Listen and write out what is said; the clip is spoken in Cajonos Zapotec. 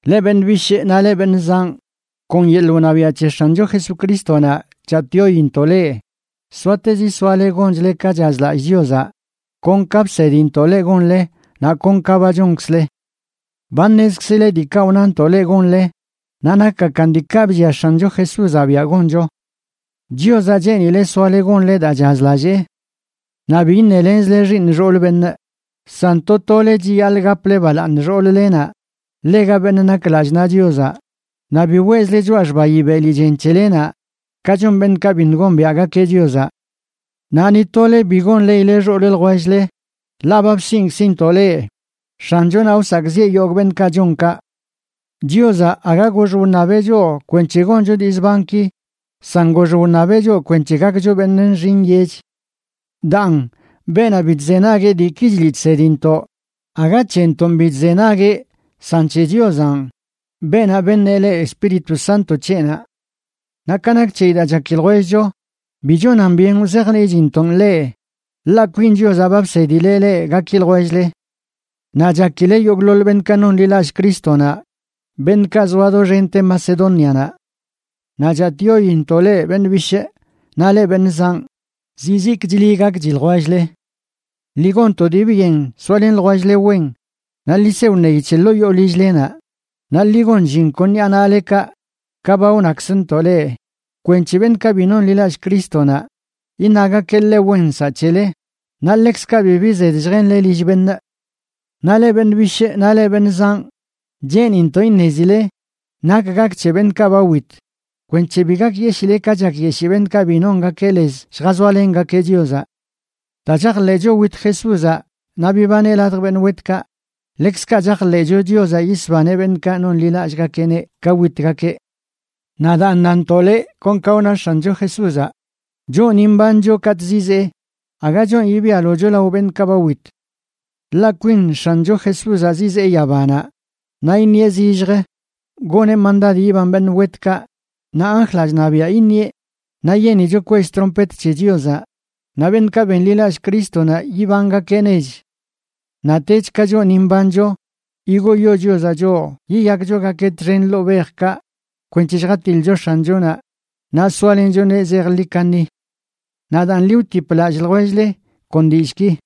Leꞌ beṉꞌ bishꞌ naꞌ leꞌ beṉꞌ zanꞌ, kon yeḻꞌ wṉabiaꞌ c̱he X̱ancho Jesucrístonaꞌ, chatꞌyointoꞌ leꞌ soatezi soale gonchle ka chazlallꞌ Chiozaꞌ, kon ka bsedintoꞌ leꞌ gonle naꞌ kon ka ba chonkzle. Ba ṉezkzile diikaꞌ wnantoꞌ leꞌ gonle, naꞌ nakgakan diikaꞌ bllia X̱ancho Jesúzaꞌ biaꞌ goncho. Chiozaꞌ cheenileꞌ soale gonle daa chazlallee. Naꞌ bi iṉelenzle xiiṉ xool beṉꞌ, san to tole chiyaḻꞌ gaple balaaṉ xool-lenaꞌ ḻega beṉꞌ nak lallꞌ naꞌ Chiozaꞌ, naꞌ biꞌ weꞌzle choꞌa xbayi beli chen c̱helenaꞌ, ka chon beṉꞌkaꞌ biṉꞌ gombiaꞌgakeꞌ Chiozaꞌ. Naꞌ ni tole bi gonḻeꞌile xool ljwell-le ḻaꞌ ba bsiꞌnkzintoꞌ leꞌ X̱anchonaꞌ wsakꞌziꞌe yogꞌ beṉꞌkaꞌ chon kaꞌ. Chiozaꞌ aga gox wṉabeꞌ choꞌ kwenc̱he goncho dii zbanki, san gox wṉabeꞌ choꞌ kwenc̱he gakcho beṉꞌ nxi nyech. Daan, beenaꞌ bi chzenagueꞌ diiki chliꞌ chsedintoꞌ aga c̱hentoꞌn bi chzenagueꞌ, san c̱he Chiozanꞌ, beenaꞌ beṉeꞌ leꞌ Espíritu Sánto c̱heꞌnaꞌ. Naꞌ ka nak c̱heyi daa chaki ljwellcho, bi chonan byen wzajniꞌchintoꞌn leꞌ, ḻaꞌ kwin Chiozaꞌ ba bsedileꞌ leꞌ gaki ljwell-le. Naꞌ chakile yogꞌḻoḻ beṉꞌkaꞌ nonḻilallꞌ Crístonaꞌ, beṉꞌkaꞌ zoa doxente Macedónianaꞌ. Naꞌ chatꞌyointoꞌ leꞌ beṉꞌ bishꞌ naꞌ leꞌ beṉꞌ zanꞌ, zizikchli gakchi ljwell-le. Ḻi gon to dii byen soalen ljwell-le wen, naꞌ ḻi se wṉeyi c̱he ḻoo yoo lill-lenaꞌ, naꞌ ḻi gon llin kon ṉiꞌa naꞌlekaꞌ ka ba wnakzntoꞌ leꞌ kwenc̱he beṉꞌkaꞌ bi nonḻilallꞌ Crístonaꞌ iṉagakeꞌ ḻe wen nsaꞌ c̱hele, naꞌ ḻekzkaꞌ bibi zed lljenle lill beṉꞌ. Naꞌ leꞌ beṉꞌ bishꞌ naꞌ leꞌ beṉꞌ zanꞌ, cheenintoꞌ iṉezile nak gak c̱he beṉꞌkaꞌ ba wit kwenc̱he bi gakyeshile ka chakyeshii beṉꞌkaꞌ bi nongakeꞌ lez lljazoalengakeꞌ Chiozaꞌ. Daa chajḻeꞌcho wit Jesúzaꞌ naꞌ bibaneꞌ ladj beṉꞌ wetkaꞌ, ḻekzkaꞌ chajḻeꞌcho Chiozaꞌ yisbaneꞌ beṉꞌkaꞌ nonḻilallꞌgakeꞌneꞌ ka witgakeꞌ. Naꞌ daan, nantoꞌ leꞌ kon ka wna X̱ancho Jesúzaꞌ: Choꞌ ni mbancho katꞌ zizee, aga chonꞌ yibialocho lao beṉꞌkaꞌ ba wit. Ḻaꞌ kwin X̱ancho Jesúzaꞌ zizee yabanaꞌ, naꞌ iṉieꞌ zillj goneꞌ mandad yiban beṉꞌ wetkaꞌ, naꞌ anjlaꞌ chṉabiaꞌ iṉieꞌ naꞌ yenicho kwell trompet c̱he Chiozaꞌ, naꞌ beṉꞌkaꞌ benḻilallꞌ Crístonaꞌ yibangakeꞌ nech. Naꞌtech, ka choꞌ ni mbancho, yigoyo Chiozaꞌ choꞌ yiyakchogakeꞌ txen ladj bejkaꞌ kwenc̱he lljatiḻcho X̱anchonaꞌ, naꞌ soalenchoneꞌ zejḻi kaṉi. Naꞌ daan, ḻi wtip lallꞌ ljwell-le kon dillꞌki.